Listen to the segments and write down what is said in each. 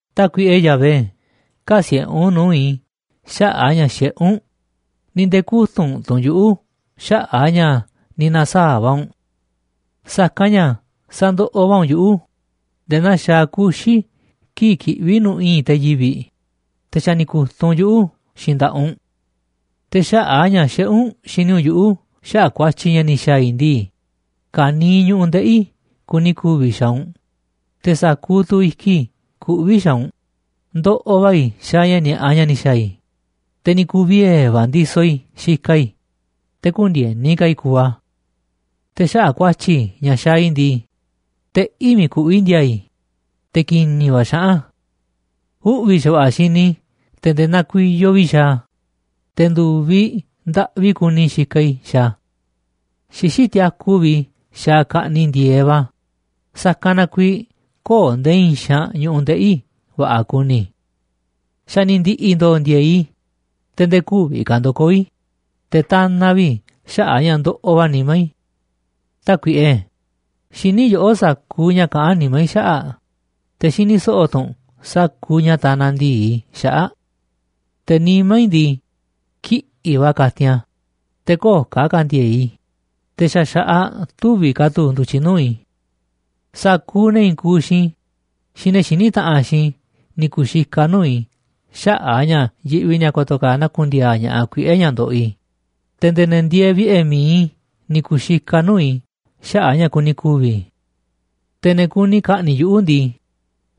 Tákuiꞌe Yahvé, kä̱siꞌe̱ u̱nꞌ nuu̱ꞌ i̱ xaꞌa̱ꞌ a̱ ña̱ xiꞌé u̱nꞌ, ni̱ nde̱e̱ kü̱tunꞌ tu̱ u̱nꞌ yuꞌu̱ xaꞌa̱ꞌ a̱ ña̱ ni̱ na̱saa̱ꞌ va̱ u̱nꞌ. Sa̱kanꞌ ña̱ sandoꞌoꞌ va̱ u̱nꞌ yuꞌu̱ nde̱e̱ naa xaaꞌ kuxi̱ kii̱ꞌ kiꞌví nu̱ꞌ i̱i̱nꞌ te̱ yivi̱ꞌ, te̱ xa̱ ni̱ ku̱tunꞌ u̱nꞌ yuꞌu̱ xiinꞌ nda̱ꞌaꞌ u̱nꞌ. Te̱ xaꞌa̱ꞌ a̱ ña̱ xiꞌé u̱nꞌ xini u̱nꞌ yuꞌu̱ xaꞌa̱ꞌ ku̱a̱tyi̱ ña̱ ni̱ xa̱a̱ i̱ ndii, ka̱niiꞌ ñu̱ꞌuꞌ ndeꞌi̱ i̱ kuni ku̱vi̱ xaaꞌ u̱nꞌ, te̱ sa̱kuuꞌ tu̱ i̱kiꞌ i̱ kuꞌví xaaꞌ u̱nꞌ. Ndoꞌoꞌ va̱ i̱ xaaꞌ ña̱ ni̱a̱ꞌa ña̱ ni̱ xa̱a̱ i̱, te̱ ni̱ ku̱u̱ vie̱ va̱ a̱ ndisoꞌ i̱ xikaꞌ i̱, te̱ kü̱ndi̱e̱ni ka̱ i̱ kuuꞌ a̱. Te̱ xaꞌa̱ꞌ ku̱a̱tyi̱ ña̱ xaaꞌ i̱ ndii, teꞌí miiꞌ kuꞌví ndi̱a̱a̱ i̱, te̱ ki̱ni̱ va̱ xaꞌán a̱. Uꞌvi̱ xa̱va̱ꞌa̱ xini i̱ te̱ nde̱e̱ nakuiyoꞌ vi̱ꞌ i̱ xaaꞌ a̱, te̱ ndu̱viꞌ ndaꞌvi kuni i̱ xikaꞌ i̱ xaaꞌ a̱. Xixí tiaku vi̱ꞌ i̱ xaaꞌ ka̱ꞌniꞌ ndi̱e̱eꞌ va̱, sa̱kanꞌ na kuiiꞌ köo̱ꞌ nde̱e̱ i̱i̱n xaanꞌ ñu̱ꞌuꞌ ndeꞌi̱ i̱ va̱ꞌa̱ kuni. Xa̱ ni̱ ndi̱ꞌi̱ ndo̱o̱ ndi̱e̱e̱ꞌ i̱, te̱ nde̱e̱ kü̱vi̱ ka̱ ndo̱koo̱ i̱, te̱ tanaꞌ vi̱ꞌ i̱ xaꞌa̱ꞌ a̱ ña̱ ndoꞌoꞌ va̱ nimá i̱. Tákuiꞌe, xiní yoꞌó sa̱kuuꞌ ña̱ kaꞌán nimá i̱ xaꞌa̱ꞌ, te̱ xini so̱ꞌo̱ tu̱ u̱nꞌ sa̱kuuꞌ ña̱ tanaꞌ ndi̱i i̱ xaꞌa̱ꞌ. Te̱ nimá i̱ ndii, kiꞌi̱ꞌ va̱ katin a̱, te̱ köo̱ꞌ ka̱ ka̱ndi̱e̱e̱ꞌ i̱, te̱ xa̱ xa̱ꞌaꞌ tüviꞌ ka̱ tu̱ ndu̱tyiꞌ nuu̱ꞌ i̱. Sa̱kuuꞌ ne̱ i̱i̱n kuuꞌ xiinꞌ i̱ xiinꞌ ne̱ xiní taꞌanꞌ xiinꞌ i̱ ni̱ kuxikaꞌ nuu̱ꞌ i̱ xaꞌa̱ꞌ a̱ ña̱ yiꞌvi ni̱a̱ ko̱to̱ ka̱ naku̱n ndi̱a̱a̱ ña̱ꞌaꞌ kuiꞌe̱ ña̱ ndoꞌoꞌ i̱, te̱ nde̱e̱ ne̱ ndieeꞌ vi̱ꞌe̱ mi̱iꞌ i̱ ni̱ ku̱u̱ xikaꞌ nuu̱ꞌ i̱ xaꞌa̱ꞌ ña̱ kuni ku̱vi̱ i̱. Te̱ ne̱ kuni ka̱ꞌni̱ꞌ yuꞌu̱ ndii,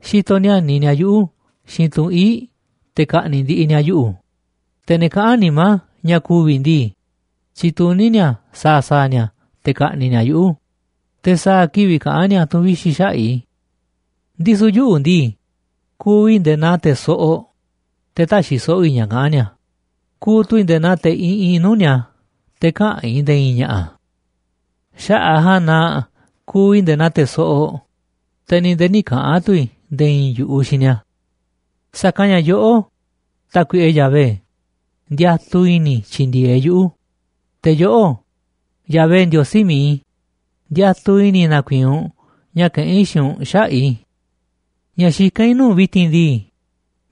xitoꞌ níániꞌ ni̱a̱ yuꞌu̱ xiinꞌ tunꞌ ii̱ꞌ te̱ ka̱ꞌni̱ꞌ ndiꞌiꞌ ni̱a̱ yuꞌu̱, te̱ ne̱ kaꞌán nimá ña̱ ku̱vi̱ i̱ ndii, tyituní ni̱a̱ sa̱a̱ sa̱a̱ ni̱a̱ te̱ ka̱ꞌni̱ꞌ ni̱a̱ yuꞌu̱, te̱ sa̱a̱ kivi̱ꞌ kaꞌán ni̱a̱ tu̱n vixi̱ xaꞌa̱ꞌ i̱. Ndisu̱ yuꞌu̱ ndii, kuuꞌ i̱ nde̱e̱ naa te̱ soꞌoꞌ, te̱ täxiꞌ so̱ꞌo̱ i̱ ña̱ kaꞌán ni̱a̱, kuuꞌ tu̱ i̱ nde̱e̱ naa te̱ iꞌinꞌ nuu̱ꞌ ni̱a̱, te̱ käꞌán i̱ nde̱e̱ i̱i̱n ña̱ꞌa̱. Xaꞌa̱ꞌ a̱ ja̱a̱nꞌ na kuuꞌ i̱ nde̱e̱ naa te̱ soꞌoꞌ, te̱ ni̱ nde̱e̱ nï̱ kaꞌa̱n tu̱ i̱ nde̱e̱ i̱i̱n yu̱ꞌuꞌ xiinꞌ ni̱a̱. Sa̱kanꞌ ña̱ yoꞌó, Tákuiꞌe Yahvé, ndiatuꞌ i̱ni̱ i̱ tyi̱ndi̱e̱eꞌ yuꞌu̱, te̱ yoꞌó, Yahvé Ndiosí mi̱iꞌ i̱, ndiatuꞌ i̱ni̱ i̱ na̱ku̱i̱i̱n u̱nꞌ ña̱ kaꞌán i̱ xiinꞌ u̱nꞌ xaꞌa̱ꞌ i̱. Ña̱ xikán i̱ nuu̱ꞌ u̱nꞌ vi̱ti̱n ndii,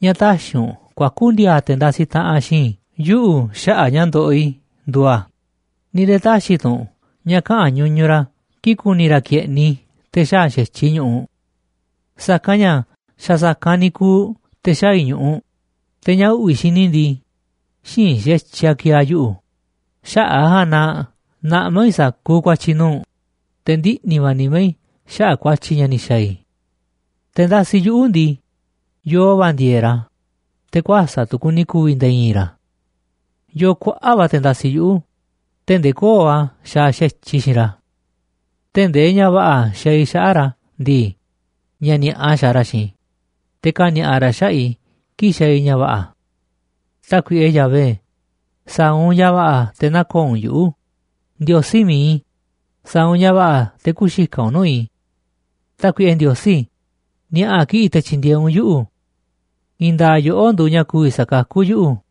ña̱ tä̱xi̱ u̱nꞌ kuaku̱ ndi̱a̱a̱ te̱ ndasiꞌ taꞌanꞌ xiinꞌ i̱ yuꞌu̱ xaꞌa̱ꞌ ña̱ ndoꞌoꞌ i̱ nduuꞌ a̱, ni̱ nde̱e̱ tä̱xi̱ tu̱ u̱nꞌ ña̱ kaꞌa̱n ñuñuꞌ ra̱ kii̱ꞌ ku̱ni̱ ra̱ ke̱ꞌniꞌ i̱ te̱ xaa̱ xa̱tyiꞌ i̱ ñu̱ꞌuꞌ. Sa̱kanꞌ ña̱ xa̱ sa̱kanꞌ ni̱ kuuꞌ te̱ xaa̱ i̱ ñu̱ꞌuꞌ, te̱ ña̱ uꞌvi̱ xini i̱ ndii, xïinꞌ xa̱tyiꞌ a̱ ki̱e̱e̱ a̱ yuꞌu̱. Xaꞌa̱ꞌ a̱ ja̱a̱nꞌ na naꞌmá i̱ sa̱kuuꞌ ku̱a̱tyi̱ i̱ nuu̱ꞌ u̱nꞌ, te̱ ndiꞌni̱ va̱ nimá i̱ xaꞌa̱ꞌ ku̱a̱tyi̱ ña̱ ni̱ xa̱a̱ i̱. Te̱ ndasiꞌ yuꞌu̱ ndii, yo̱o̱ va̱ ndi̱e̱e̱ꞌ ra̱, te̱ kuäsa̱ꞌ tu̱ kuni ku̱vi̱ nde̱e̱ i̱i̱n ra̱. Yoo kuaꞌa̱ꞌ va̱ te̱ ndasiꞌ yuꞌu̱ tee̱ꞌ ndee köo̱ꞌ a̱ xaaꞌ xa̱tyiꞌ i̱ xiinꞌ ra̱. Tee̱ꞌ ndee ña̱ va̱ꞌa̱ xaaꞌ i̱ xaꞌa̱ꞌ ra̱ ndii, ña̱ ni̱a̱ꞌa xaaꞌ ra̱ xiinꞌ i̱, te̱ kani̱a̱ꞌa ra̱ xaꞌa̱ꞌ i̱ kii̱ꞌ xaaꞌ i̱ ña̱ va̱ꞌa̱. Tákuiꞌe Yahvé, sa̱a̱ u̱nꞌ ña̱ va̱ꞌa̱ te̱ nä̱ko̱o̱ u̱nꞌ yuꞌu̱. Ndiosí mi̱iꞌ i̱, sa̱a̱ u̱nꞌ ña̱ va̱ꞌa̱ te̱ kü̱xikaꞌ u̱nꞌ nuu̱ꞌ i̱. Tákuiꞌe Ndiosí, ni̱a̱ꞌa̱ kiꞌi̱ꞌ te̱ tyi̱ndi̱e̱eꞌ u̱nꞌ yuꞌu̱. I̱i̱n nda̱a̱ꞌ yoꞌó nduuꞌ ña̱ ku̱vi̱ sa̱kakú yuꞌu̱.